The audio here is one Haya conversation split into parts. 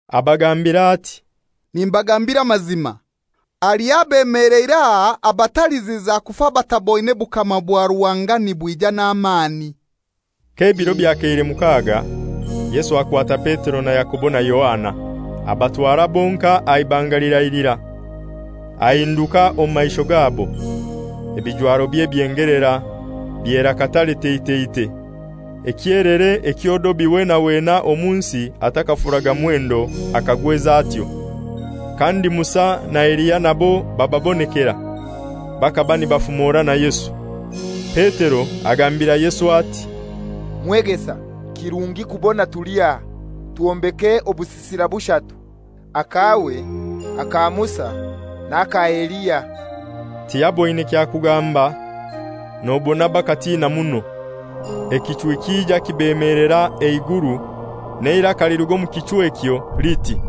Abagambira ati, «Nimbagambira amazima, haliho abeemeleire aha abataliziza kufa bataboine bukama bwa Ruhanga nibwija n'amani.» K'ebiro byakeire mukaga, Yesu akwata Petero na Yakobo na Yohana, abatwara bonkai aha ibanga lirai lirai; ahinduka omu maisho gabo, ebijwarobye byengelera, byera katare teiteitei, ekyelere ekyo dobi wena wena omu nsi atakafuraga mwendo akagwez'atyo. Kandi Musa na Eliya nabo bababonekera; bakaba nibafumora na Yesu. Petero agambira Yesu ati, «Mwegesa, kirungi kubona tuli aha. Twombeke obusisira bushatu: Akawe, aka Musa n'aka Eliya.» Tiyaboine kya kugamba, nobona bakatina muno. Ekichwi kija kibemelera eiguru, n'eiraka liruga omu kichwi ekyo liti,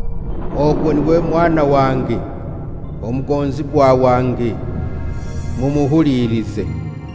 «Ogu n'iwe Mwana wange, omugonzibwa wange, mumuhulilize.»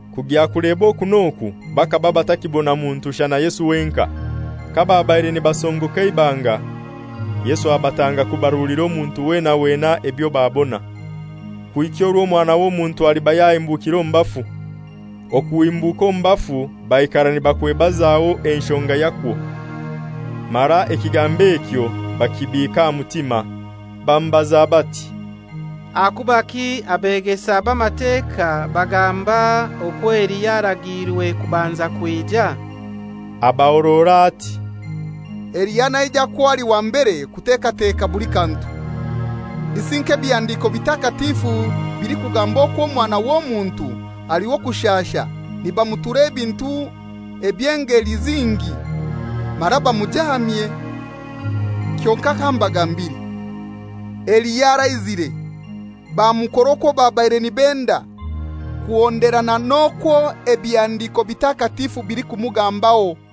Kugya kuleba oku n'oku bakaba batakibona muntu shana Yesu wenkai. Kababaire nibasongoka eibanga, Yesu abatanga kubarulira omuntu wena wena ebyo babona, kuhika orwo Omwana w'Omuntu aliba yahimbukire omu bafu. Okuhimbuka omu bafu baikara nibakwebazaho enshonga yakwo, mara ekigambo ekyo bakibiika aha mutima. Bamubaza bati, «Ahakubaki abegesa b'Amateka bagamba okwo Eliya aragiirwe kubanza kwija?» Abahorora ati, «Eliya naijakwo ali wa mbere kutekateka buli kantu; isi nk'ebihandiko bitakatifu bilikugamba okwo Omwana w'Omuntu ali w'okushasha nibamutura ebintu eby'engeli zingi mara bamujaamye? Kyonkai kambagambire: Eliya araizire, bamukora okwo babaire nibenda, kuhonderana n'okwo ebihandiko bitakatifu bilikumugambaho.»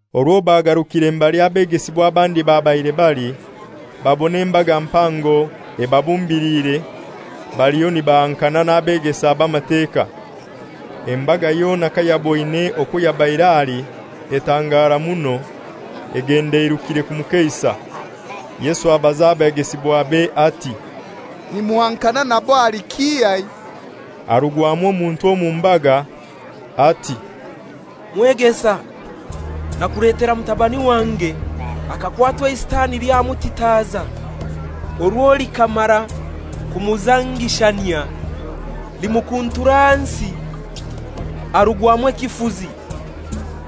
Orwo bagarukire mbali abegesibwa abandi babaire bali, babona embaga mpango ebabumbiliire baliho nibahankana n'abegesa b'Amateka. Embaga yona kayaboine atyo, etangara muno, egenda eirukire kumukeisa. Yesu abaza abegesibwabe ati, «Nimuhankana nabo ahali kihai?» Harugwamu omuntu omu mbaga ati, «Mwegesa, nakuletera mutabani wange, akakwatwa eiSitani lyamutitaza. Orwo likamara kumuzangishanyia, limukuntura ahansi arugwamu ekifuzi,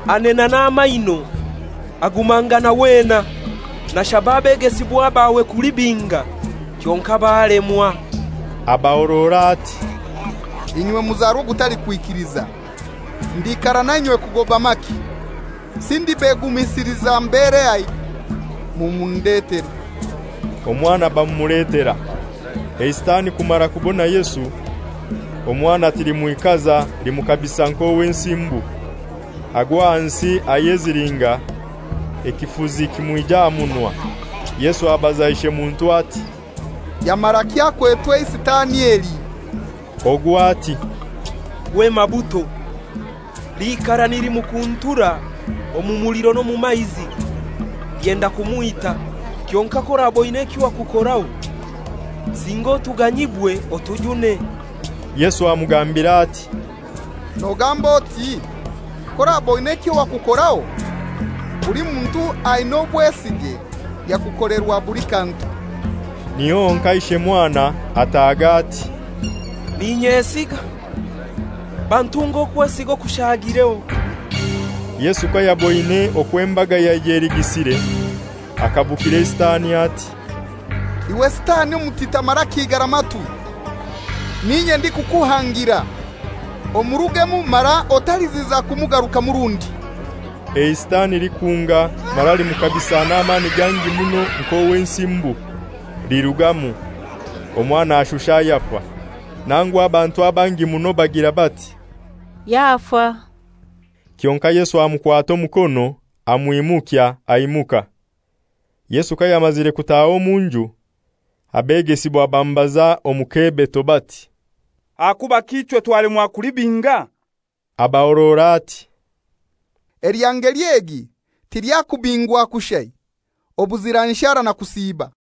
anena n'amaino, agumangana wena. Nashaba abegesibwa bawe kulibinga kyonkai balemwa.» Abahorora ati, «Inywe muzarwa ogutalikwikiliza, ndiikara nainywe kugoba maki? Isi ndibegumisiliza mberehai? Mumundetere.» Omwana bamumuletera. Sitani kumara kubona Yesu, omwana tilimwikaza, limukabisa nk'owensimbu, agwa ahansi ayezilinga, ekifuzi kimwija aha munwa. Yesu abaza ishemuntu ati, «Yamaraki akwetwe eiSitani eli?» Ogu ati, «Kwema buto. Liikara nilimukuntura omu muliro n'omu maizi, lyenda kumwita. Kyonkai k'oraba oina ekyo wakukoraho, singa otuganyibwe otujune.» Yesu amugambira ati, «Nogamba oti, ‹K'oraba oina ekyo wakukoraho?› Buli muntu aina obwesige, yakukolerwa buli kantu.» Niho honkai ishe mwana ataaga ati, «N'inyesiga; bantunge okwesiga okushagireho!» Yesu kayaboine okwo embaga yaija eligisire, akabukira eiSitani ati, «Iwe Sitani omutita mara ekigara matwi, n'inye ndikukuhangira, omurugemu mara otaliziza kumugarukamu rundi.» EiSitani likunga mara limukabisa n'amani gangi muno nk'owensimbu, lirugamu, omwana ashusha ayafa; nangu abantu abangi muno bagira bati, «Yafa.» Kyonkai Yesu amukwata omukono amwimukya, aimuka. Yesu kayamazire kutaha omu nju, abegesibwa bamubaza omu kebeto bati, «Ahakubaki ichwe twalemwa kulibinga?» Abahorora ati, «Elya ngeli egi tilyakubingwa kushai obuzira nshara na kusiiba.»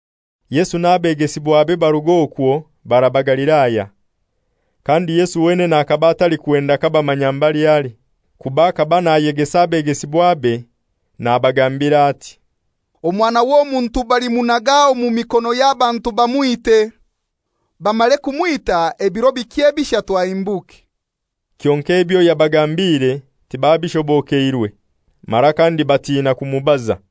Yesu n'abegesibwabe barug'okwo baraba Galilaya. Kandi Yesu wenene akaba atalikwenda kabamanya mbali ali; kuba akaba nayegesa abegesibwabe, nabagambira ati, «Omwana w'Omuntu bhalimunaga omu mikono y'abantu bamwite. Bamare kumwita ebiro bikye bishatu ahimbuke.» Kyonkai ebyo yagambire tibabishobokeirwe, mara kandi batina kumubaza.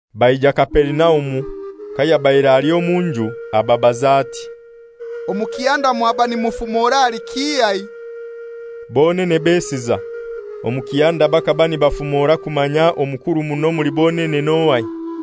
Baija Kaperinaumu. Kayabaire ali omu nju ababaza ati, «Omu kihanda mwaba nimufumora ahali kihai?» Bonene besiza. Omu kihanda bakaba nibafumora kumanya omukuru muno omuli bonene n'ohai.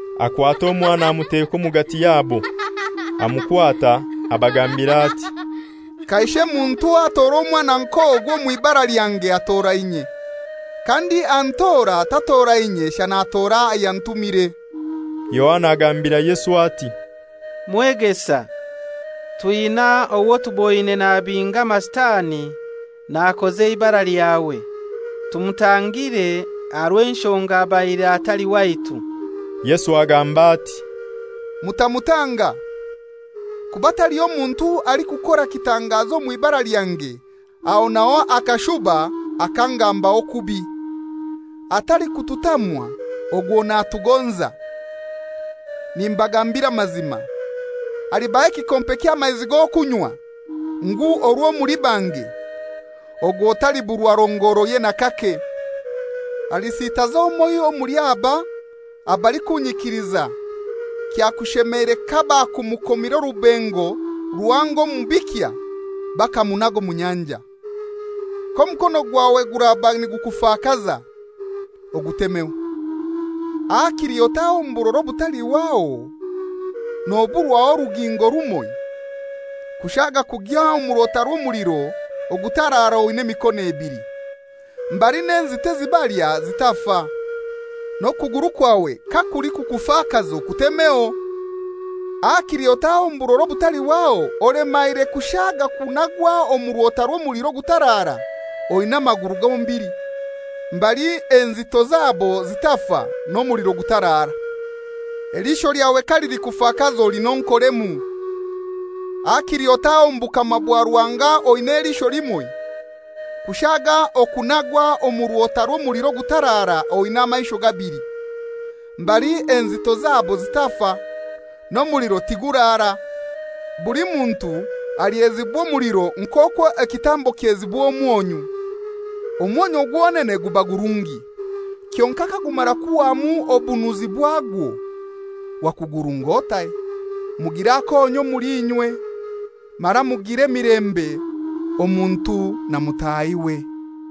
Akwata omwana amuteka omugati yabo, amukwata abagambira ati, «Kaishe muntu atoora omwana nk'ogu omw'ibara lyange atora inye; kandi antora tatora inye shana atora ayantumire.» Yohana agambira Yesu ati, «Mwegesa, twina owo tuboine nabinga Amasitani nakoza eibara lyawe. Tumutangire aha rw'enshonga abaire atali waitu.» Yesu agamba ati, «Mutamutanga; kuba taliho muntu alikukora kitangazo omw'ibara lyange aho n'aho akashuba akangambaho kubi. Atalikututamwa ogwo natugonza. Nimbagambira amazima, alibaha ekikompe ky'amaizi g'okunywa ngu orwo muli bange, ogwo taliburwa rongoroye n'akake. «Alisitaza omoiho omuli aba abalikunyikiliza kyakushemeire kabakumukomire orubengo ruhango omu bikya bakamunaga omu nyanja. K'omukono gwawe guraba nigukufakaza, ogutemeho, hakili otahe omu burora obutalihwaho noburwaho orugingo rumoi, kushaaga okugya omu rwota rw'omuliro ogutarara oina emikono ebili, [mbali n'enzito ezibalya zitafa.] N'okuguru kwawe kakulikukufakaza okutemeho. Hakili otahe omu burora obutalihwaho olemaire kushaaga okunagwa omu rwota rw'omuliro ogutarara oina amaguru gombili, [mbali enzito zabo zitafa, n'omuliro gutarara.] Eliisho lyawe kalilikufakaza olinonkoremu; hakili otahe omu bukama bwa Ruhanga oina eliisho limoi, kushaaga okunagwa omu rwota rw'omuliro ogutarara oina amaisho gabili, mbali enzito zabo zitafa, n'omuliro tiguraara. Buli muntu alyezibwa omuliro nk'okwo ekitambo kyezibwa omwonyu. Omwonyu gwonene guba gurungi; kyonkai kagumara kuhwamu obunuzi bwagwo, wakugurung'otai? Mugire akonyu omuli inywe, mara mugire emilembe omuntu na mutahiwe.»